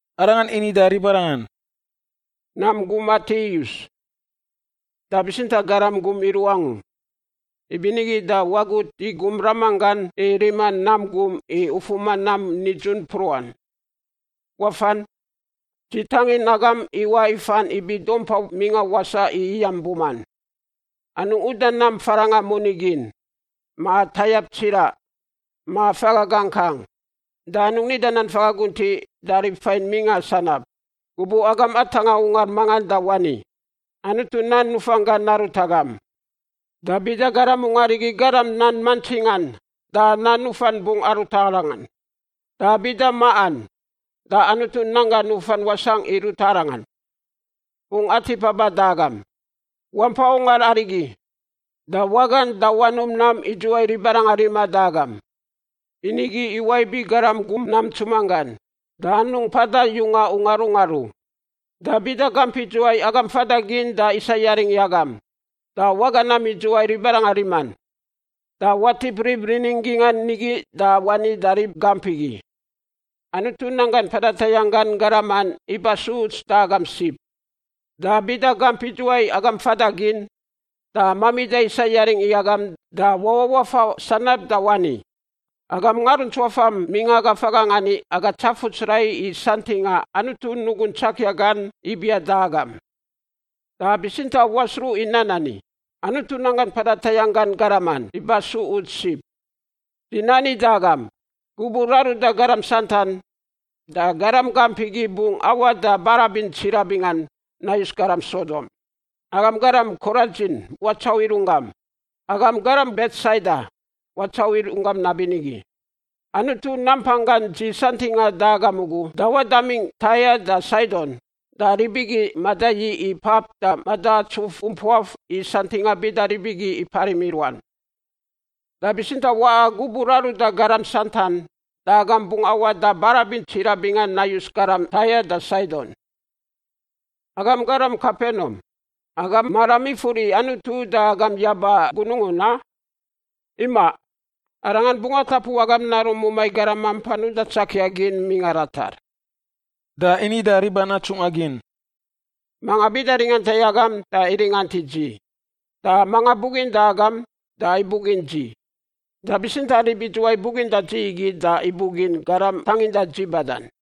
Arangan ini da ribarangan, “Nam gum atiꞌ iyus, da bitsintaꞌ garam gum iruꞌ angu. Ibinigi da wagut i gum Ramanggan i rima mamaꞌ gum i ufuma nam nidzun mpruꞌan. Wafan! Dzi tangin agam iwaꞌ ifan ibi dumpa mingꞌa wasaꞌ i iyam buman. Anungꞌ uda nam farangꞌa moni gin, ma tayap tsiraꞌ, ma faga gakang. Da anungꞌ nida nan faga guntiꞌ da rib fain mingꞌa sanab. “Gubuꞌ agam atangꞌa ungar mangan da wani, ‘Anutu nan nufan gan narut agam.’ Da bida garam ungar igi garam nan mantsingan da nan nufan bungꞌ arut arangan. Da bida maꞌan da Anutu nan gan nufan wasangꞌ i ruta arangan; bungꞌ atip aba da agam. Wampa ungar arigi, da wagan da wanum nam idzuwai ribarangan riman da agam, i nigi iwaꞌ ibi garam gum nam ntsuman gan. Da anungꞌ mpada yunga ungar ungar u. “Da bida gamp idzuwai agam fada gin da isa yaring i agam da waga nam idzuwai ribarangan riman, da watip rib rinin gingꞌan nigi da wani da rib gamp igi, ‘Anutu nanggan mpada tayangꞌ gan garaman iba su uts da agam sib.’ Da bida gamp idzuwai agam fada gin da mamida isa yaring i agam da wawaꞌ wafa sanab da wani, ‘Agam ngaruntsuafam mingꞌa aga fagangꞌ ani aga tsafuts rai i santingꞌa Anutu nugun tsakia gan ibiaꞌ da agam, da bitsintaꞌ wasruꞌ i nan ani: Anutu nanggan mpada tayangꞌ gan garaman iba su uts sib.’ Dzi nani da agam, gubuꞌ raruda garam santan, da garam gamp igi bungꞌ awaꞌ da barabin tsiraꞌ bingan nayus garam Sodom. “Agam garam Koradzin watsauꞌ i runggam! Agam garam Betsaida watsauꞌ i runggam nabinigi! Anutu nampanggan dzi santingꞌan da agam ugu dawaꞌ damingꞌ Taia da Saidon, da rib igi madayiꞌ i pap da madaatsuf umpuaf i santingꞌa bida rib igi iparim i ruan. Da bitsintaꞌ, waꞌa gubuꞌ raruda garam santan, da agam bungꞌ awaꞌ da barabin tsiraꞌ bingan nayus garam Taia da Saidon. Agam garam Kepenaum, agam maram ifur i Anutu uda agam yaba gunungun, a? Imaꞌ! Arangan bungꞌ atapu agam naruꞌ mumai garam mampan uda tsakia gin mingꞌa ratar.” Da ini da riban atsungꞌa gin, “Manga bida ringanta i agam da iringant i dzi, da manga buginda agam da ibugin dzi, da bitsintaꞌ rib idzuwai buginda dzi igi da ibugin garam tanginda dzi badan.”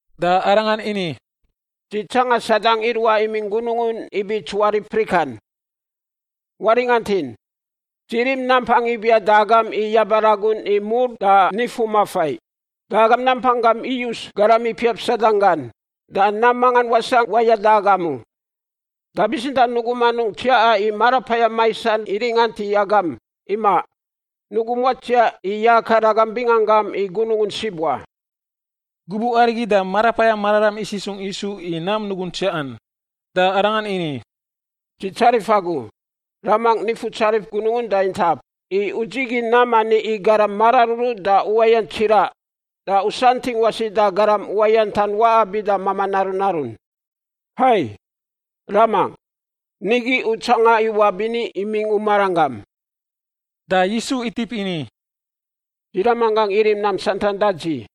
Da Arangan ini, “Dzi tsangan Sadang iruaꞌ imingꞌ gunungun ibi tsuarip prikan. Waringantin, dzi rim nampang ibiaꞌ da agam i yaba ragun i mur da nifumafai da agam nampang gam iyus garam ipiap Sadang gan, da nam mangan wasangꞌ wayada agam u. Da bitsintaꞌ nugum anungꞌ tsiaꞌan i marapayam maisan iringant i agam, imaꞌ, nugum watsiaꞌ i yakar agam binganggam i gunungun sib wa.” Gubuꞌ arigi da Marapayam Mararam isisungꞌ Yisu i nam nugun tsiaꞌan, da Arangan ini, “Dzi tsarif Agu, Ramangꞌ Nifutsarif gunungun da intap, i U dzigin nam ani i garam mararuru da uwayant tsiraꞌ da U santingꞌ wasi da garam uwayantan waꞌa bida mamaꞌ naru narun. Hai, Ramangꞌ, nigi U tsanga iwaꞌ bini imingꞌ U maranggam.” Da Yisu itip ini, “Dzi Ramanggangꞌ irim nam santan da dzi.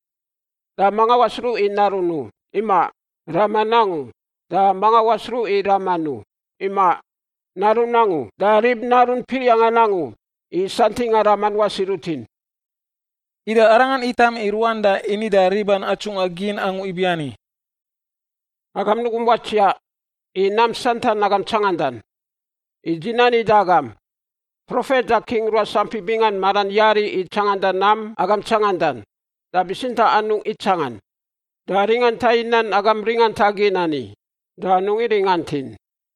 Da manga wasruꞌ i Narun u, imaꞌ, Raman angu. Da manga wasruꞌ i Raman u, imaꞌ, Narun angu da rib Narun piriangꞌan angu i santingꞌa Raman wasi rutin.” Ida Arangan itam i ruan da ini da riban atsungꞌa gin angu ibiani, “Agam nugum watsiaꞌ i nam santan agam tsangandan. I dzi nani da agam, profet da king ruas ampi bingan maran yari i tsanganda nam agam tsangandan, da bitsintaꞌ anungꞌ itsangan, da ringanta i nan agam ringanta gin ani, da anungꞌ iringantin.”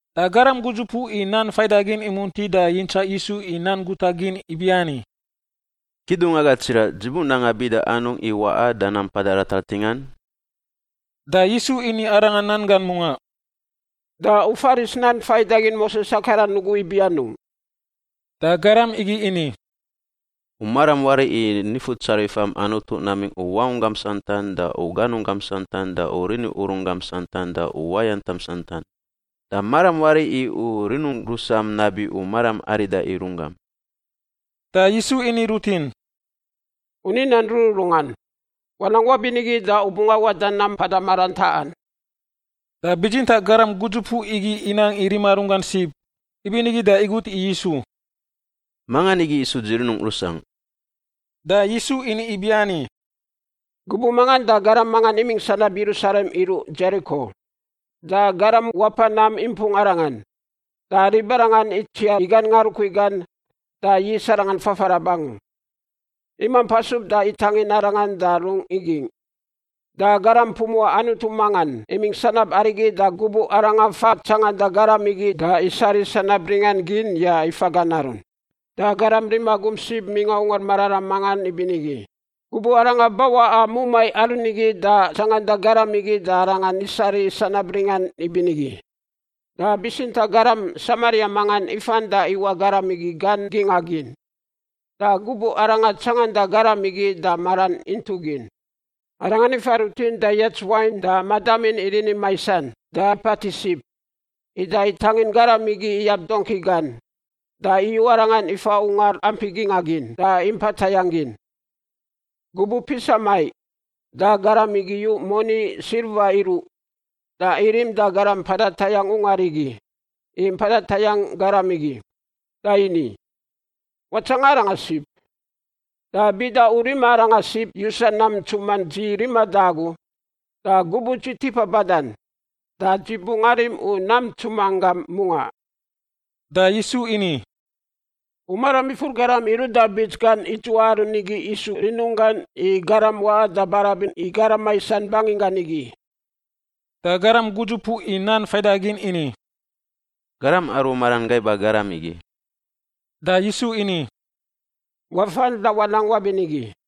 Da garam gudzupuꞌ i nan faidagin imunti da yintsaꞌ Yisu i nan guta gin ibiani, “Kidungwaga tsiraꞌ, dzi bunanga bida anungꞌ i waꞌa da nam mpada ratar ntingan?” Da Yisu ini arangan nan gan mungaꞌ, “Da u faris nan faidagin Moses akaran ugu ibi anungꞌ?” Da garam igi ini, “U maram wari i Nifutsarifam Anutu namingꞌ u wangunggam santan da ganunggam santan da rini urun gam santan da uwayantam santan. Da maram wari i u rinum rusam nabi u maram arida i runggam.” Da Yisu ini rutin, “U ni nan rururungan. Wanang wabinigi da u bungꞌ awaꞌ da nam mpada maran taꞌan.” Da bitsintaꞌ garam gudzupuꞌ igi inang i rima runggan sib, ibinigi da igut i Yisu, “Mangan igi isu dzi rinungꞌ rusangꞌ?” Da Yisu ini ibiani, “Gubuꞌ mangan da garam mangan imingꞌ sanab Yerusalem iruꞌ Dzeriko, da garam wapa nam impung arangan. Da ribarangan itsiar i gan ngarukui gan da yis arangan fafarab angu, imamp asub da itangin arangan da rungꞌ igingꞌ. Da garam pumuꞌa Anutu mangan imingꞌ sanab arigi da gubuꞌ arangan fa tsanganda garam igi da isariꞌ sanab ringan gin ya ifa gan arun. Da garam rima gum sib mingꞌa Ungar Mararam mangan ibinigi gubuꞌ aranga bawaꞌa mumai aru nigi da tsanganda garam igi da arangan isariꞌ sanab ringan ibinigi. Da bitsintaꞌ garam Samaria mangan ifan da ifawaꞌ garam igi gan gingꞌa gin, da gubuꞌ arangan tsanganda garam igi da maran intuꞌ gin. Arangan ifa rutin da iyats wain da madamin i rini maisan da ipatiꞌ sib. Ida itangin garam igi iyab dongki gan da iyu arangan ifa ungar ampi gingꞌa gin da impa tayangꞌ gin. Gubuꞌ pisa maiꞌ da garam igi iyu moni silva iruꞌ da irim da garam mpada tayangꞌ ungar igi i mpada tayangꞌ garam igi. Da ini, ‘Watsanga arangan sib, da bida u rima aranga sib yusa nam ntsuman dzi riman da agu, da gubuꞌ dzi tipa badan, da dzi bungꞌ arim u nam ntsuman gam mungaꞌ.’” Da Yisu ini, “U maram ifur garam iruꞌ da bits gan idzuwai aru nigi isu rinunggan i garam waꞌa da barabin i garam maisan banginggan igi?” Da garam gudzupuꞌ i nan faidagin ini, “Garam aru maran gaiba garam igi.” Da Yisu ini, “Wafan da wanang wabinigi.”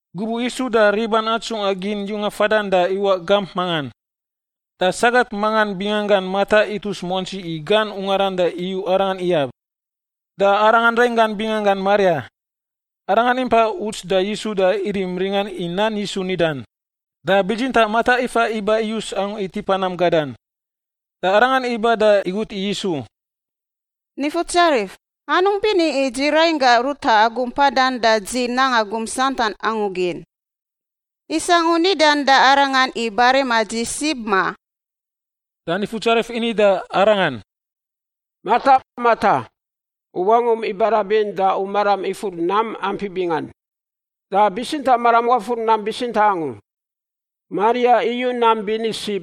Gubuꞌ Yisu da riban atsungꞌa gin yunga fadan da iwaꞌ gamp mangan. Da sagat mangan binganggan Mata itus muantsi i gan ungaran da iyu Arangan iyab. Da aranga rainggan binganggan Maria, arangan impa uts da Yisu da irim ringan i nan Yisu nidan. Da bitsintaꞌ Mata ifa iba iyus angu i tipa nam gadan. Da arangan iba da igut i Yisu, “Nifutsarif, anungꞌ bini i dzi rainggangꞌ ruta agu mpadan da dzi nanga gum santan angu gin. Isangꞌ u nidan da arangan i barima dzi sib, ma?” Da Nifutsarif ini da arangan, “Mata, Mata, u wangum ibarabin da u maram ifur nam ampi bingan, da bitsintaꞌ maram wafur nam bitsintaꞌ angu. Maria iyu nam bini sib,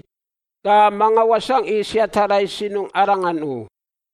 da mangan wasangꞌ i siata rai sinungꞌ arangan u.”